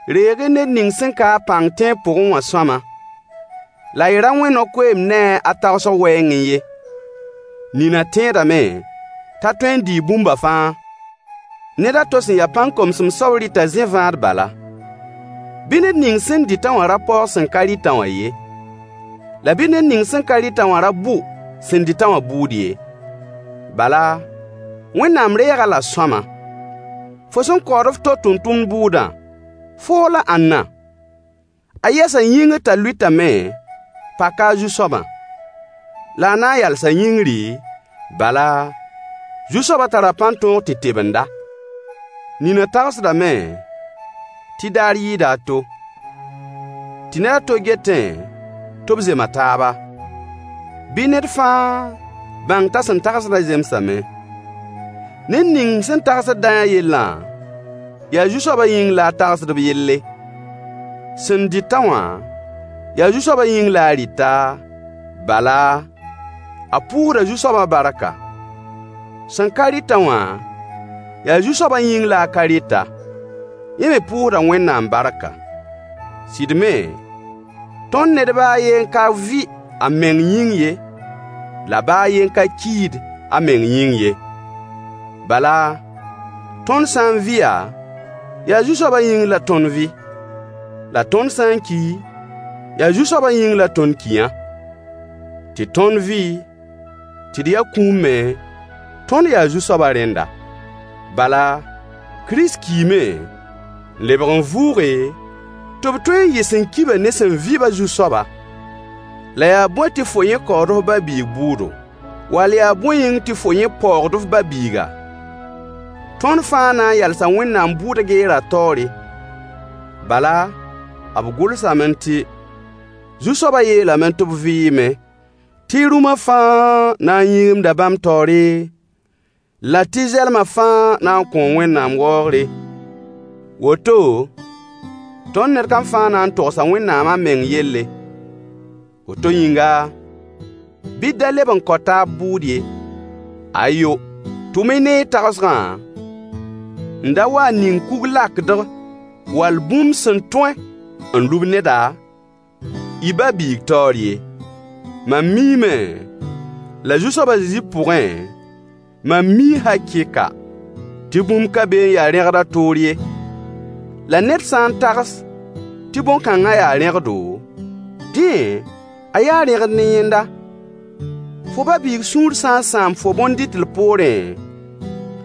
Reeg-y ned ning sẽn ka-a pãng tẽeb pʋgẽ wã sõama, la y ra wẽ no-koeemd ne-a a tagsg wɛɛngẽ ye. Nina tẽedame t'a tõe n dɩɩ bũmba fãa. Ned a to sẽn ya pãn-komsem soab rɩta zẽ-vãad bala. Bɩ ned ning sẽn dɩt-a wã ra paoog sẽn ka rɩt-a wã ye, la bɩ ned ning sẽn ka rɩt-a wã ra bʋ sẽn dɩt-a wã bʋʋd ye. Bala, Wẽnnaam reeg-a-la sõama. Fo sẽn kaood f to tʋmtʋmd bʋʋdã, foo la ãnna? A yɛsa yĩngr t'a lʋɩtame, paka a zu-soabã. La a na n yalsa yĩngri, bala, Zu-soabã tara pãn-tõog tɩ tebend-a. Nina tagsdame tɩ daar yɩɩda a to. Tɩ ned a to getẽ tɩ b zema taaba. Bɩ ned fãa bãng t'a sẽn tagsdã zemsame. Ned ning sẽn tagsd dayã yellã, yaa Zu-soabã yĩng la a tagsd b yelle. Sẽn dɩt-a wã, yaa Zu-soabã yĩng la a rɩta, bala, a pʋʋsda Zu-soabã barka. Sẽn ka rɩt-a wã, yaa Zu-soabã yĩng la a ka rɩta. Yẽ me pʋʋsda Wẽnnaam barka. Sɩd me, tõnd ned baa a yen ka vɩ a meng yĩng ye, la baa a yen ka kiid a meng yĩng ye. Bala, tõnd sã n vɩya, yaa Zu-soabã yĩng la tõnd vɩ. La tõnd sã n ki, yaa Zu-soabã yĩng la tõnd kiyã. Tɩ tõnd vɩ, tɩ d ya kũum me, tõnd yaa Zu-soabã rẽnda. Bala, Kirist kiime n lebg n vʋʋge, tɩ b tõe n yɩ sẽn ki-bã ne sẽn vɩ-bã Zu-soaba. La yaa bõe tɩ fo yẽ kaood f ba-biig bʋʋdo? Wall yaa bõe yĩng tɩ fo yẽ paoogd f ba-biiga? Tõnd fãa na n yalsa Wẽnnaam bʋʋd geerã taoore. Bala, b gʋlsame tɩ: Zu-soabã yeelame tɩ b vɩɩme, tɩ rũmã fãa na n yĩgimda bãmb taoore, la tɩ zɛlma fãa na n kõo Wẽnnaam waoogre. Woto tõnd ned kam fãa na n togsa Wẽnnaam a meng yelle. Woto yĩnga, bɩ d da leb n kao taab bʋʋd ye. Ayo! Tʋm-y ne y tagsgã n da wa n ning kug-lakdg wall bũmb sẽn tõe n lub neda, y ba-biig taoor ye. Mam miime, la Zu-soab a Zezi pʋgẽ, mam mii hakɩɩka, tɩ bũmb ka be n ya rẽgd a toor ye. La ned sã n tags tɩ bõn-kãngã yaa rẽgdo, dẽ a yaa rẽgd ne yẽnda. Fo ba-biig sũur sã n sãam fo bõn-dɩtl poorẽ,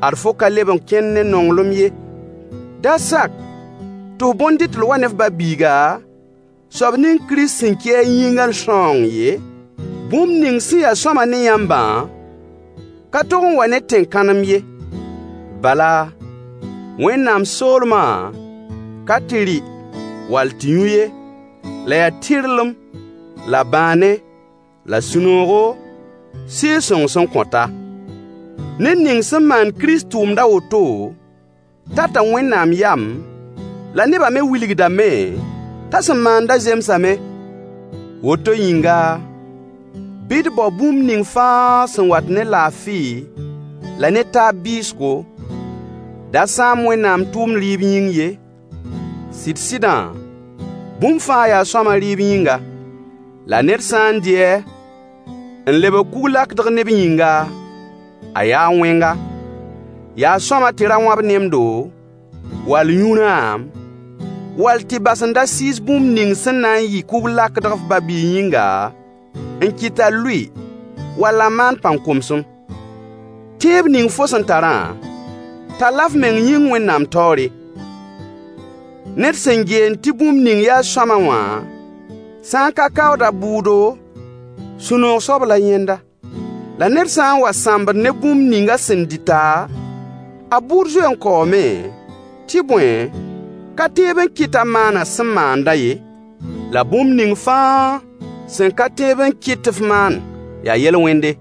ad fo ka leb n kẽnd ne nonglem ye. Da sak tɩ f bõn-dɩtl wa ne f ba-biiga, soab ning Kirist sẽn ki a yĩngã sãoong ye. Bũmb ning sẽn ya sõama ne yãmbã ka tog n wa ne tẽn-kãnem ye. Bala, Wẽnnaam soolmã, ka tɩ rɩ wall tɩ yũ ye, la yaa tɩrlem la bãane, la sũ-noogo, Sɩɩg-sõng sẽn kõta. Ned ning sẽn maand Kirist tʋʋmd a woto tata Wẽnnaam yam, la nebã me wilgdame t'a sẽn maandã zemsame. Woto yĩnga, bɩ d bao bũmb ning fãa sẽn wat ne laafɩ la ne taab bɩɩsgo. Da sãam Wẽnnaam tʋʋmd rɩɩb yĩng ye. Sɩd-sɩdã, bũmb fãa yaa sõama rɩɩb yĩnga. La ned sã n dɩ-a n lebg kug-lakdg neb yĩnga, a yaa wẽnga. Yaa sõama tɩ ra wãb nemdo, wall yũ rãam, wall tɩ bas n da sɩɩs bũmb ning sẽn na n yɩ kug-lakdg f ba-biig yĩnga [n kɩt a lʋɩ wall a maan pãn-komsem]. Tẽeb ning fo sẽn tarã, tall-a f meng yĩng Wẽnnaam taoore. Ned sẽn geend tɩ bũmb ning yaa sõama wã sã n ka kaood a bʋʋdo, sũ-noog soab la yẽnda. La ned sã n wa sãmbd ne bũmb ning a sẽn dɩta, a bʋʋd zoe n kaoome, tɩ bõe, ka tẽeb n [kɩt t'a maan a sẽn maandã ye]. La bũmb ning fãa sẽn ka tẽeb n kɩt tɩ f maan yaa yel-wẽnde.